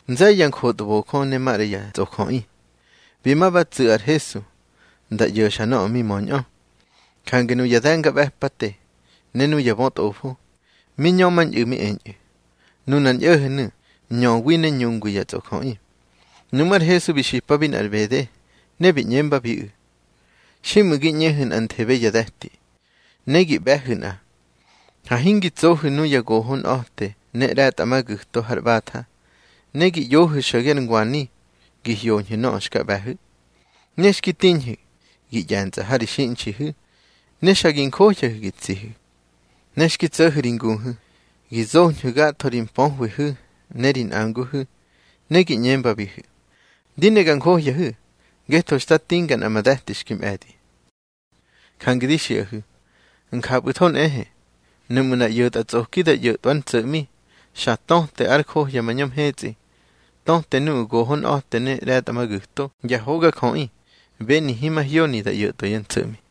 Nze̱ye̱ ya njotbojö ne maꞌra ya tsꞌojöꞌi, bi ma ba tsu̱ ar Hesu nda ꞌyo̱xa nöꞌö mi möñꞌö. Jange nuya de̱ngaꞌbe̱pate ne nuya bötꞌofo, mi ñömañꞌu̱ mi eñꞌu̱: —Nunar ñꞌo̱ho̱nu̱ ñöwi ne ñungwi ya tsꞌojöꞌi. Nuꞌmú̱ ar Hesu bi xipabi nꞌar ꞌbede, ne bi ꞌñembabiꞌu̱: —Xiꞌmu̱ gi ꞌñehu̱ nꞌanthebe ya de̱ti, ne gi ꞌbe̱hu̱ nꞌa, ha hingi tsohu̱ nuya gohonꞌa̱te ne ꞌre̱tꞌamagu̱to har ꞌbatha, ne gi ꞌyohu̱ xo̱ge ar ngwani, gi hyoñhu̱ nöꞌö xka ꞌbe̱hu̱. Ne xki tiñhu̱, gi ꞌye̱ntsꞌa ha ri xiꞌnxihu̱, ne xa gi njohyahu̱ gi tsihu̱. Ne xki tso̱hu̱ ri nguhu̱, gi zoñhu̱ gatho ri mpöhwihu̱ ne ri nꞌanguhu̱, ne gi ꞌñembabihu̱: Di ne ga njohyahu̱, ngetho xta tinga nꞌa ma de̱ti xki mꞌe̱di. Jange di xiꞌahu̱, njapꞌu̱tho nꞌehe, nuꞌmu̱ nꞌar ꞌyo̱tꞌatsꞌoki da ꞌyo̱tꞌwa ár ntso̱ꞌmi, xa töte ar johya mañö mhetsꞌi, töta nuꞌu̱ gohonꞌa̱te ne ꞌre̱tꞌamagu̱to ya hogajöꞌi beni himahyoni da ꞌyo̱tꞌwa yá ntso̱ꞌmi.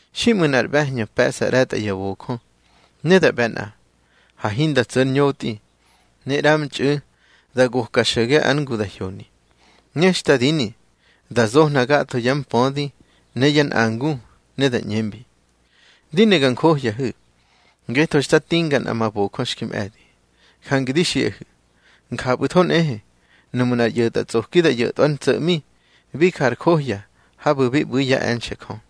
Xiꞌmu̱ nꞌar ꞌbe̱hñö pe̱ꞌsa ꞌre̱tꞌa ya bojö ne da ꞌbe̱ nꞌa, ha hinda tso̱ ar ñotꞌi, ne ꞌramtxꞌu̱ da goka xo̱ge ár ngu da hyoni. Ne xta dini, da zohna gatho yá mpödi ne yá nꞌangu, ne da ꞌñembi: Di ne ga njohyahu̱, ngetho xta tinga nꞌa ma bojö xki mꞌe̱di. Jange di xiꞌahu̱, njapꞌu̱tho nꞌehe, nuꞌmu̱ nꞌar ꞌyo̱tꞌatsꞌoki da ꞌyo̱tꞌwa ár ntso̱ꞌmi, bi ja ar johya habu̱ bi ꞌbu̱i yá e̱nxe̱ Jö.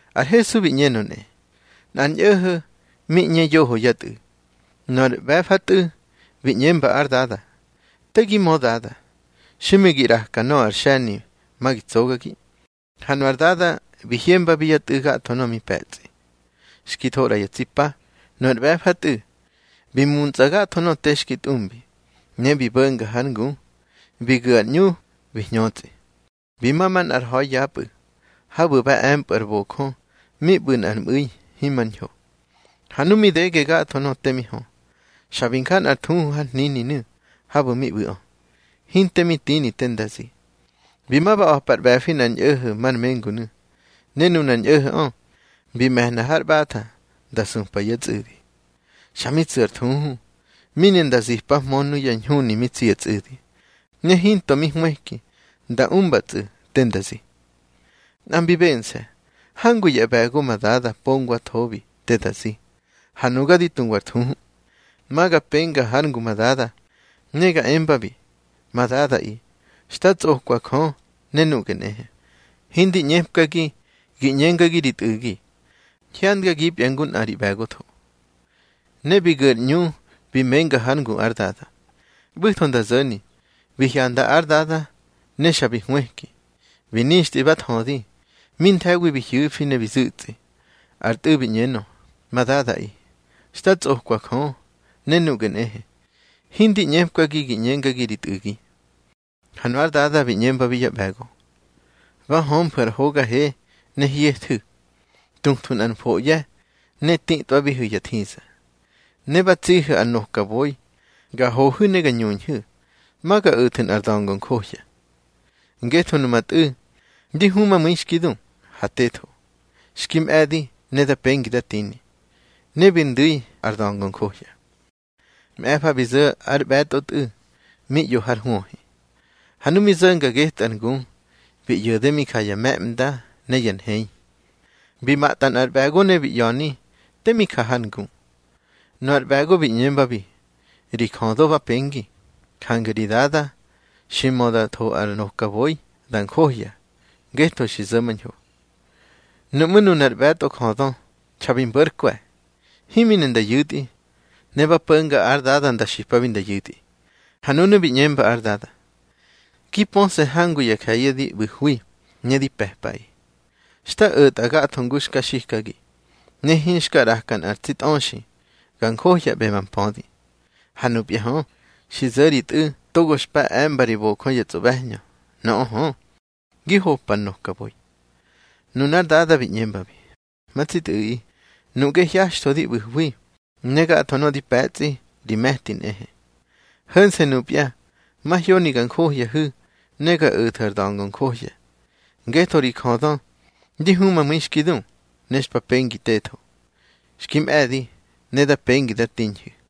Ar Hesu bi ꞌñenö nꞌe: —Nꞌar ñꞌo̱ho̱ mi ꞌñe yoho yá tꞌu̱. Nöꞌö ar ꞌbe̱fatꞌu̱ bi ꞌñemba ár dada: Te gi mö dada, xiꞌmu̱ gi ꞌraka nöꞌö ar xe̱ni ma gi tsogagi. Ha nu ár dada bi hyembabi yá tꞌu̱ gatho nöꞌö mi pe̱tsꞌi. Xki tho ꞌra ya tsi pa, nu ar ꞌbe̱fatꞌu̱ bi muntsꞌa gatho nöꞌö te xki tꞌumbi. Ne bi bo̱nga hár ngu, bi gu̱ ar ꞌñu bi hñötsꞌi, bi ma manꞌar ha̱i yapꞌu̱, habu̱ ba e̱mpꞌu̱ ár bojö mi ꞌbu̱ nꞌar ꞌmu̱i himar ñho. Ha nu mi dege gatho nöꞌö te mi hö, xa bi nja nꞌar thuhu har hnininu̱ habu̱ mi ꞌbu̱ꞌö, hinte mi tini te nda zi. Bi ma ba a̱pa ar ꞌbe̱fi nꞌar ñꞌo̱ho̱ mar mengunu̱, ne nunar ñꞌo̱ho̱ꞌö bi me̱hna hár ꞌbatha nda supa yá tsꞌu̱di. Xa mi tsu̱ nꞌar thuhu, mi ne nda zipahmö nuyá ñhuni mi tsi ya tsꞌu̱di, ne hinto mi hwëki nda umbatsꞌu̱ te nda zi. Nꞌa mbi bense̱: Hangu yá ꞌbe̱go ma dada pongwathobi te da zi, ha nuga di tuwa ar thuhu. Ma ga penga hár ngu ma dada, ne ga embabi: Ma dadaꞌi, xta tsꞌokwa Jö, ne nuꞌge nꞌehe. Hindi ꞌñepkagi gi ꞌñengagi ri tꞌu̱gi. Hyandgagipya ngu nꞌa ri ꞌbe̱gotho. Ne bi gu̱ ar ꞌñu bi menga hár ngu ár dada. ꞌBu̱tho nda zo̱ni, bi hyanda ár dada, ne xa bi hwëki, bi nixtꞌi ba thödi. Mi nthe̱wi bi hyu̱fi, ne bi zu̱ꞌtsi. Ar tꞌu̱ bi ꞌñenö: Ma dadaꞌi, xta tsꞌokwa Jö, ne nuꞌge nꞌehe. Hindi ꞌñepkagi gi ꞌñengagi ri tꞌu̱gi. Ha nu ár dada bi ꞌñembabi yá ꞌbe̱go: Ba hömfu̱ ar hoga he, ne hyethu̱. Tuthwu̱ nꞌar mfoꞌye̱, ne titꞌwabihu̱ ya thiza. Ne ba tsihu̱ ar nokaboi, ga hohu̱ ne ga ñuñhu̱. Ma ga o̱thu̱ nꞌar da̱ngo njohya. Ngetho numa tꞌu̱ ndi humamu̱i xki du, ha tetho. Xki mꞌe̱di ne da pengi da tini. Ne bi ndu̱i ar da̱ngo njohya. Mꞌe̱fa bi zo̱ ar ꞌbe̱tꞌotꞌu̱ mi ꞌyo har hwöhi. Ha nu mi zo̱nga getꞌu̱ ar ngu, bi ꞌyo̱de mi ja ya me̱ꞌmda ne ya nhei. Bi matꞌa nꞌar ꞌbe̱go, ne bi ꞌya̱ni te mi ja har ngu. Nu ar ꞌbe̱go bi ꞌñembabi: Ri jödö ba pengi, jange ri dada xi mö nda tho ar nokaboi da njohya, ngetho xi zo̱mañho. Nuꞌmú̱ nunar ꞌbe̱tꞌojödö xa bi mbo̱ ár kwe̱, himi ne nda yu̱tꞌi. Ne ba po̱nga ár dada nda xipabi nda yu̱tꞌi. Ha nunu̱ bi ꞌñemba ár dada: Gi pöse̱ hangu ya je̱ye̱ di ꞌbu̱hwi, ne di pe̱pꞌaꞌi. Xta o̱tꞌa gatho ngu xka xikagi, ne hinxka ꞌraka nꞌar tsi tꞌöxi ga njohyaꞌbe ma mpödi. Ha nupya hö, xi zo̱ ri tꞌu̱ togo xpa e̱mba ri bojö ya tsꞌoꞌbe̱hñö. Nöꞌö hö, gi hopa ar nokaboi. Nunár dada bi ꞌñembabi: Ma tsi tꞌu̱ꞌi, nuꞌge hyaxtho di ꞌbu̱hwi, ne gatho nöꞌö di pe̱tsꞌi ri me̱ti nꞌehe. Ho̱nse̱ nupya mahyoni ga njohyahu̱, ne ga o̱thu̱ ar da̱ngo njohya. Ngetho ri jödö ndi humamu̱i xki du, ne xpa pengi tetho. Xki mꞌe̱di, ne da pengi da tiñhu̱.